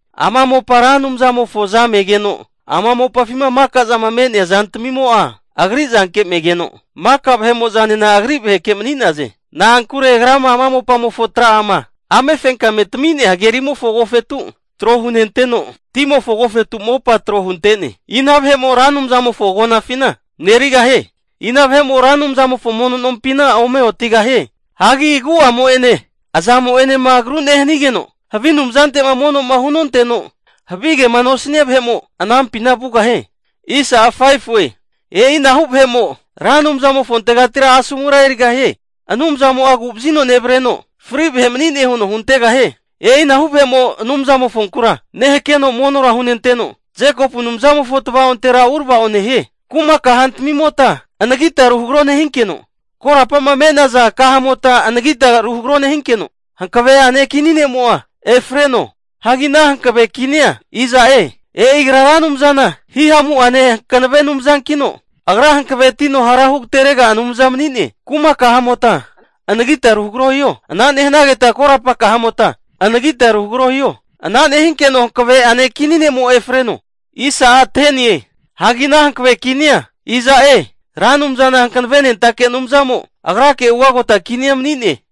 Ama mopa Ra Anumzamofo suza megeno, ama mopafima maka'zama me'nea zantamimo'a agri zanke megeno, maka vahe'mo'zanena agri vaheke mani'naze. Na'ankure agra ama mopamofo tra'ama amefenkame tami'nea hagerimofo agofetu tro hunenteno, timofo agofetu mopa tro hunte'ne. Ina vahe'mo Ra Anumzamofo agonafina marerigahie? Ina vahe'mo Ra Anumzamofo ruotage mono nompina ome otigahie? Hagi agu'amo'ene azamo'enema agru nehanigeno, havi anumzante'ma mono'ma hunonteno havigema nosania vahemo anampina vugahie. E'inahu vahe'mo Ra Anumzamofontegatira asomura erigahie. Anumzamo'a agu'vazino nevreno, fatgo vahe mani'ne huno huntegahie. E'inahu vahe'mo Anumzamofonkura nehakeno monora hunenteno, Jekopu Anumzamofo tvaontera urava'o nehie. Kuma kahantamimota anagita ru hagro nehinkeno, korapa'ma me'naza kahamota anagita ru hagaro nehinkeno, hankave'ane kini ne'mo'a efreno. Hagi ana hankave kinia iza'e? E'i agra Ra Anumzana hihamu'ane hankanave Anumzankino, Agra hankavetino hara hugaterega Anumza mani'ne. Kuma kahamota anagita ruhagro hiho, ana nehanageta korapa kahamota, anagita ru hagaro hiho. Ana nehinkeno hankave'ane kini ne'mo'a efreno. Hagi ana hankave kinia iza'e? Ra Anumzana hankavenentake Anumzamo agrake ugagota kinia mani'ne.